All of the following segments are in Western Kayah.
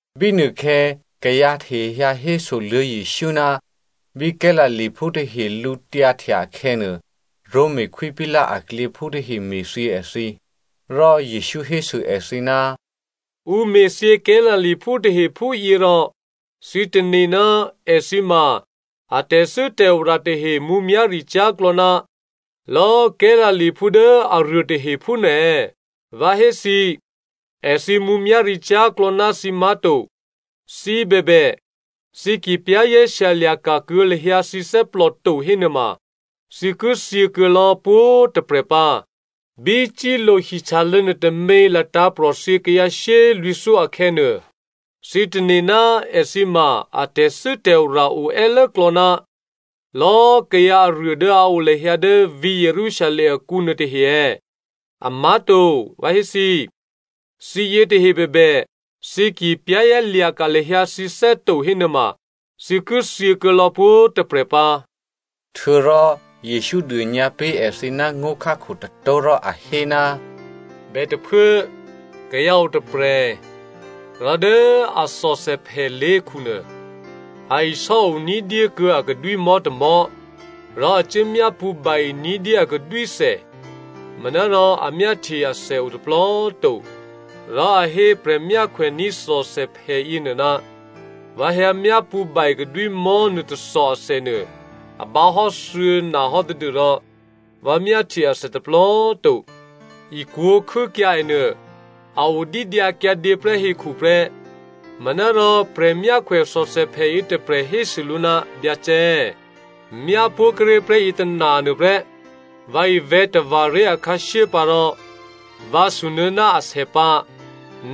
Bínuôkhè̌ kayǎ tahe hyǎ hésoluô̌ Jesǔ ná bí Galileaphú tahe lǔtyǎhtya akhè̌nuô, Roma Khwí Pilato aklyěphú tahe me̤thyě èthǐ. Rò Jesǔ hésû èthǐ, “Ǔ me̤thyě Galileaphú tahe phúyě rò thǐ tane̤ ná èthǐ ma a tè̤thû́tè̤ora tahe mǔmyá̤ricyá̤klò̌ ná lò̌ Galileaphú dố aruôtahe phúnuô è̌? Vǎ hé thǐ, èthǐ mǔmyá̤ricyá̤klò̌ ná thǐ má̤to. Thǐ bèbè, thǐ ki za̤ ní̤dûkuô̌ lahyǎ thǐné̤ to hénuôma, thǐ ki thyě kuô̌ lò̌ pwǒ̤꤮ tôprè̤ pǎ. Bí Siloa hihtyalô̌ nuôtômě latǎ̤prò̤ thyě kayǎ shyélwǐ̤thyó akhè̌nuô, thǐ tane̤ ná èthǐ ma a tè̤thû́tè̤ora o è́klò̌ ná lò̌꤮ kayǎ aruô dố a o lahyǎ dố vǐ̤ Jerusalem akǔ nuôtahe è̌? Amá̤to, vǎ hé thǐ, thǐ yětahe bèbè, thǐ ki za̤ ní̤dû lahyǎ thǐné̤ to hénuôma, thǐ ki thyěkuô̌ lò̌ pwǒ̤꤮ tôprè̤ pǎ.” Htuô̌rò Jesǔ dônyǎ pé̤ èthǐ ná ngó̤khákho tôtó̤ rò a hé, “Bètôphuố, kayǎ o tôprè̤, rò dố a thòthèphè lé̤khunuô, a isò́o ní̤dyé kuô̌ a kadwímò̤́ tômò̤́. Rò a cuố myápṳ̌ ba-e ní̤dyé a kadwíthè, manárò a myáhtye athè o tôplò꤮ to. Rò, a hé prè̤myákhwèní̤ thòthèphè yěnuô, ‘Vǎ hyǎ myápṳ̌ ba-e kadwímò̤́ nuô tôthò athènuô a bǎhò́ thuô̌na hò́ tadû́rò vǎ myáhtye athè tôplò꤮ to. Ikwǒ̤ khû́kyǎ è nuô, a o dídyǎkyǎdě prè́ hekhu prè́.’ “Manárò prè̤myákhwè thòthèphè yětôprè̤ hésû lǔ, ‘Byacè꤮, myá pó̤ kuốré̤ prè́ yětôna nuôprè́. Vǎ ivè̤̌ tava̤ ré̤ akhǎshyé pǎ rò vǎ sunuô̌ ná asè pǎ.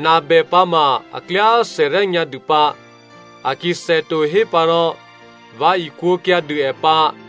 Nabè pǎ ma a klyá thèryá nyǎ dû pǎ. A ki thèto hé pǎ rò vǎ ikwǒ̤kyǎ dû è pǎ.’”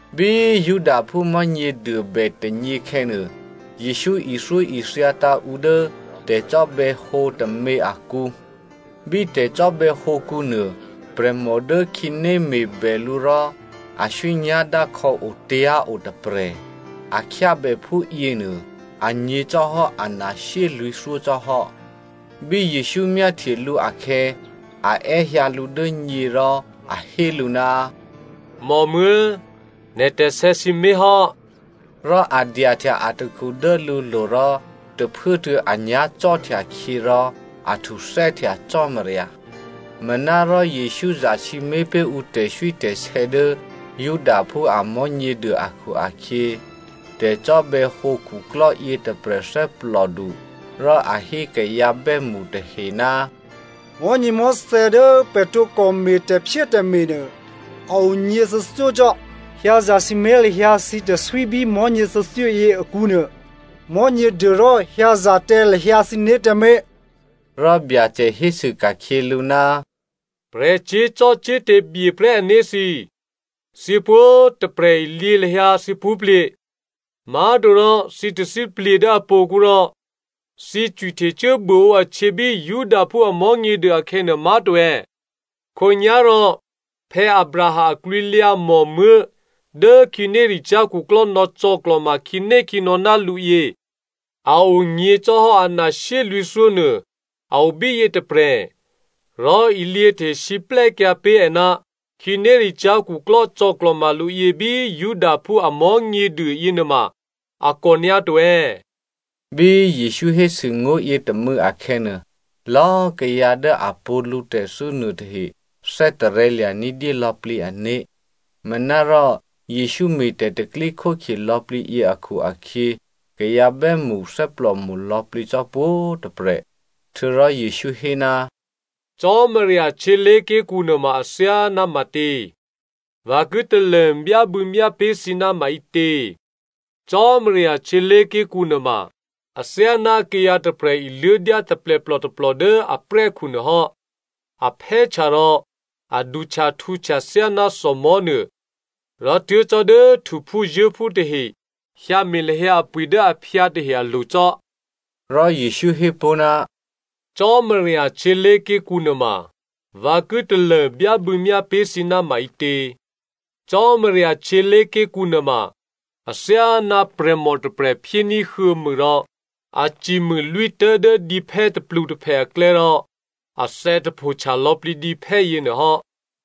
Bí Judaphú Mò̤́nyěduô bè tônyěkhè̌nuô, Jesǔ ithyóithyatǎ̤ ǔ dố tè̤cò́bè̌hǒ tômě akǔ. Bí tè̤cò́bè̌hǒkǔ nuô, prè̤mò dố khǐné me̤bè lǔ rò aswí nyá̤dákhò̌ otyá̤ o tôprè̤. A khyábè phúyěnuô anyě̤ cò́hò́ ana shyélwǐ̤thyó cò́ hò́. Bí Jesǔ myáhtye lǔ akhè̌ a è́hyǎ lǔ dố nyě rò a hé lǔ, “Mòmuố̤꤮, nè̤ tè̤sè̌ sǐmé̤ hò́.” Rò a dyahtya atakhu dố lǔlo̤ rò tôphuốtuô̌ anyá̤ cò́htyakhyě rò a htuthè́htya Cò́marya. Manárò Jesǔ zasǐmé̤ pé̤ ǔ tè̤swítè̤sè̌ dố Judaphú a Mò̤́nyěduô akhu-akhyě tè̤cò́bè̌hǒ khuklò́ yětôprè̤ thè́plòdu, rò a hé kayǎ bè́mṳ tahe, “Mò̤́nyěmò̤́thè̌ dố pè̤ tǒkò me̤ tè̤phyétè̤me̤ nuô, a o nyěthuô̌thyó cò́. Hyǎ zasǐmé̤ lahyǎ thǐ tè̤swí bí mò̤́nyě thuô̌thyóyě akǔnuô. Mò̤́nyěduô rò hyǎza tǎ lahyǎ thǐné̤ tǎmé̤.” Rò Byacè hésû ka̤khyě lǔ, “Prè̤ cyé̤zò́cò́te̤ byeprè́ ané̤ thǐ꤮ thǐ pwǒ̤꤮ tôprè̤ ilyě lahyǎ thǐ pṳ́plye̤, má̤torò thǐ tathíplye̤ dố apo̤kǔ rò thǐ cwihtecuố buôǒ ahtyě bí Judaphú Mò̤́nyěduô akhè̌nuô má̤to è̌? Khǒnyá̤rò Abraham aklwǐlyǎ mòmuố̤ dố khǐnéricyá̤ khuklò́ nò̌cò̌klò̤ma khǐnékhǐnò̌ ná lǔ yě, a onyě̤ cò́hò́ ana shyélwǐ̤thyó nuô a obíyě tôprè̤. Rò ilyěhte siplè́kyǎ pé̤ è ná khǐnéricyá̤ khuklò́ cò̌klò̤ma lǔ yě bí Judaphú a Mò̤́nyěduô yěnuôma, a kò nyǎto è̌?” Bí Jesǔ hésû ngó̤ yětômû̌ akhè̌nuô, lò̌꤮ kayǎ dố a pṳ̌ lǔ tè̤thû́ nuôtahe thè́tarè̤̌ lya̤ ní̤dyé lò̌plǐ ané̤. Manárò Jesǔ me̤ tè̤pro̤tè̤prya̤ lò̌plǐ yě akhu-akhyě, kayǎ bè́mṳ thè́plòmo̤ lò̌plǐ cò́ pwǒ̤꤮ tôprè̤. Htuô̌rò Jesǔ hé, “Cò́marya htyělé̤ké̤kǔ nuôma athyáná matě? Vǎ ki talô byábû̌myá pé̤ thǐ ná maǐtě? Cò́marya htyělé̤ké̤kǔ nuôma athyáná kayǎ tôprè̤ iluố̤dyá taplèplò tôplò dố aprè́khu nuôhò́. A phè́htya rò a duhtyahtǔhtya thyáná thòmò̤́nuô, rò tuố̤ cò́ dố htuphúzuố̤phú tahe hyǎme̤ lahyǎ apwi̤ dố aphyǎ tahe alo̤ cò́.” Rò Jesǔ hé pó̤, “Cò́marya htyělé̤ké̤kǔ nuôma vǎ ki talô byábû̌myá pé̤ thǐ ná maǐtě? Cò́marya htyělé̤ké̤kǔ nuôma athyáná prè̤mò tôprè̤ phyéní̤ huô̌mû rò a cimû lwítố̤ dố dǐphè́ tôplutôphè aklè̌ rò athè̌ tapho htyalò̌plǐ dǐphè́ yěnuôhò́.”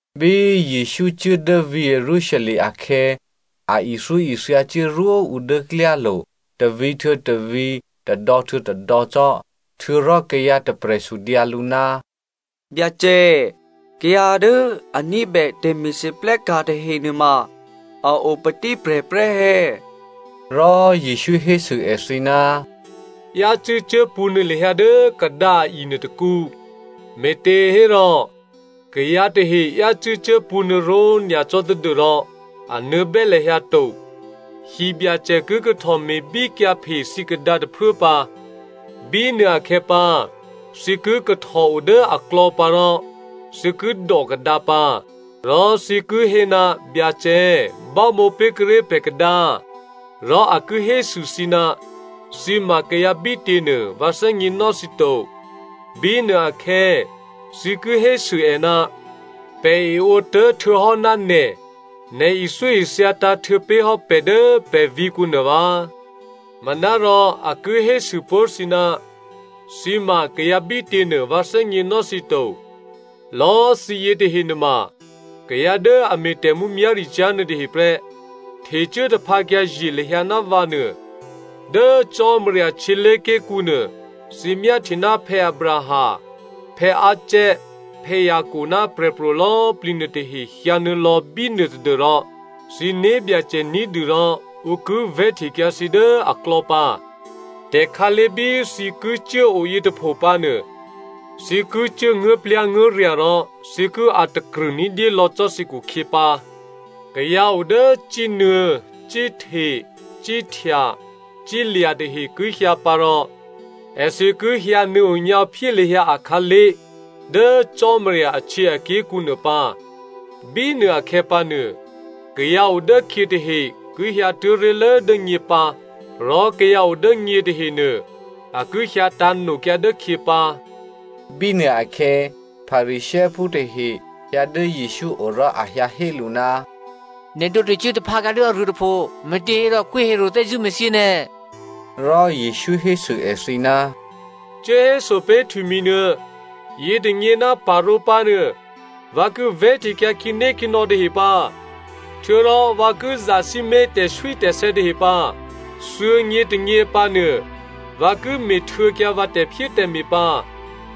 Bí Jesǔ cuố dố vǐ̤ Jerusalem akhè̌, a ithyóithya cuố rwó ǔ dố klyálo̤, tôvǐ̤ htuô̌ tôvǐ̤, tôdò̌htuô̌ tôdò̌ cò́. Htuô̌rò kayǎ tôprè̤ sudyǎ lǔ, “Byacè꤮ kayǎ dố a ní̤bè tè̤me̤lwóhteka̤ tahenuôma, a o patíprè̤ prè́ è̌?” Rò Jesǔ hésû èthǐ, “Yácû́ cuốpṳ̌nuô̌ lahyǎ dố kadǎ a-i nuôtôkǔ, me̤těhérò, kayǎ tahe yácû́ cuốpṳ̌nuô̌ ró̤nyacò́ tadû́rò a nuô̌bè́ lahyǎ to. Hibyacè ki kahtò me̤bíkyǎphe thǐ kadǎ tôphuố pǎ. Bínuôakhè̌ pǎ thǐ ki kahtò o dố aklò̌ pǎ rò thǐ ki dò kadǎ pǎ. Rò thǐ ki hé, ‘Byacè꤮ bámǒ pé̤kuô̌ré̤ pè̤ kadǎ.’ “Rò a ki hésû thǐ, ‘Thǐ ma kayǎ bítě nuô, vǎ thè́gněnò́ thǐ to.’ “Bínuôakhè̌, thǐ ki hésû è, ‘Pè̤ eǒtố̤ htuô̌hò́ ná nè̤, nè̤ ithyóithyatǎ̤ htuô̌pé̤hò́ pè̤ dố pè̤ vǐ̤kǔ nuô vǎ.’ “Manárò a ki hésû pó̤ thǐ, ‘Thǐ ma kayǎ bítě nuô vǎ thè́gněnò́ thǐ to. Lò̌꤮ thǐ yětahe nuôma kayǎ dố a me̤ tè̤mǔmyá̤ricyá̤ nuôtahe prè́, htecuố taphǎkyǎ ye̤ lahyǎ ná vǎ nuô.’ “Dố Cò́marya htyělé̤ké̤kǔ nuô, thǐ myáhtye ná Abraham, Isaac, Jacob ná prè̤pro̤ lò̌꤮ plǐ nuôtahe hyǎ nuô̌lò̌ bínuô tadû́rò thǐ né̤byacè ní̤dû rò ǔ ki vè̤́htekyǎ thǐ dố aklò̌ pǎ. Tè̤khǎlé̤ bí thǐ ki cuố o yětôpho pǎnuô, thǐ ki cuố nguố̤plyá̤nguố̤rya̤ rò thǐ ki a̤takrṳ̂ ní̤dyé lò̌ cò́ thǐ khukhyě pǎ. Kayǎ o dố cínuô̌, cíhte, cíhtya, cílya̤ tahe ki hyǎ pǎ rò èthǐ ki hyǎnuô̌ onyǎphyé lahyǎ akhǎlé̤ dố Cò́marya ahtyěaké̤kǔ nuô pǎ. Bínuô akhè̌pǎ nuô, kayǎ o dốkhyě tahe ki hyǎtuố̤ ré̤lố dố nyě pǎ, rò kayǎ o dố nyě tahenuô, a ki hyǎ tǎ̤nokyǎ dốkhyě pǎ.” Bínuôakhè̌, Pharisěophú tahe hyǎ dố Jesǔ o rò a hyǎ hé lǔ, “Nè̤ tǒ htecuố taphǎkyǎ dố aruô tôpho, me̤těhérò Khwí Herodè thè́zṳ̂́ me̤thyě nè̤.” Rò Jesǔ hésû èthǐ, “Cuốhéso pé̤ htwimi̤nuô, ‘Yětônyě ná parǒ pǎnuô, vǎ ki vè̤́htekyǎ khǐnékhǐnò̌ tahe pǎ, htuô̌rò vǎ ki zasǐmé̤ tè̤swítè̤sè̌ tahe pǎ. Thuô̌nyětônyě pǎnuô, vǎ ki me̤htuô̌kyǎ vǎ tè̤phyétè̤me̤ pǎ.’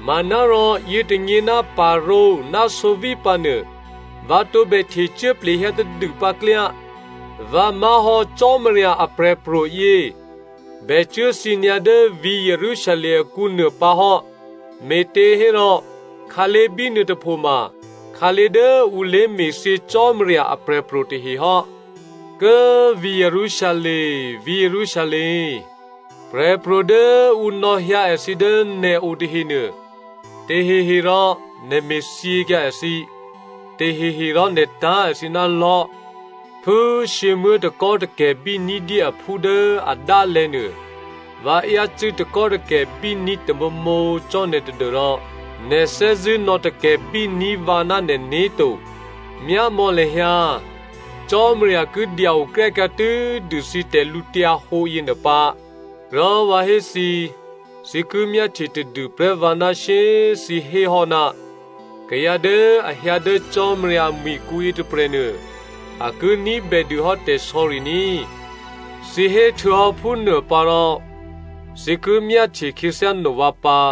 Manárò yětônyě ná parǒ ná sǒví pǎnuô, vǎ tǒbè htecuố plehyǎ tadûpǎ klyá. Vǎ má̤hò́ Cò́marya aprè̤pro̤ yě bè cuốthyě nyǎ dố vǐ̤ Jerusalem akǔnuô pǎ hò́, me̤těhérò khǎlé̤ bínuôtôpho ma khǎlé̤ dố ǔ lé̤me̤thyě Cò́marya aprè̤pro̤ tahe hò́. “Kố꤮ vǐ̤ Jerusalem, vǐ̤ Jerusalem꤮ prè̤pro̤ dố ǔ nò̌hyǎ èthǐ dố nè̤o tahenuô, taheherò nè̤ me̤thyěkyǎ èthǐ, taheherò nè̤ tá̤ èthǐ ná lò̤́. Phú shyěmuố̤ takò́takè̤bí ní̤dyé aphú dố adálè̤̌ nuô, vǎ yácû́ takò́takè̤bíní̤ tamǒmǒ cò́ nè̤ tadû́rò nè̤ thè́zṳ̂́ nò̌takè̤bí ní̤ vǎ ná nè̤né̤ to. Myámò̌ lahyǎ꤮ Cò́marya ki dya-okryákyǎ tû́dû thǐ tè̤lǔhǒdu yěnuô pǎ. Rò vǎ hé thǐ, thǐ ki myáhtye tadû prè́ vǎ ná shyé꤮ thǐ héhò́, ‘Kayǎ dố a hyǎ dố Cò́marya amwi̤kǔ yětôprè̤nuô, a ki ní̤bè dûhò́ tè̤sò̌ri ní꤮.’ Thǐ héhtuô̌hò́ phúnuôpǎrò thǐ ki myáhtye khyěthyá no vǎ pǎ.”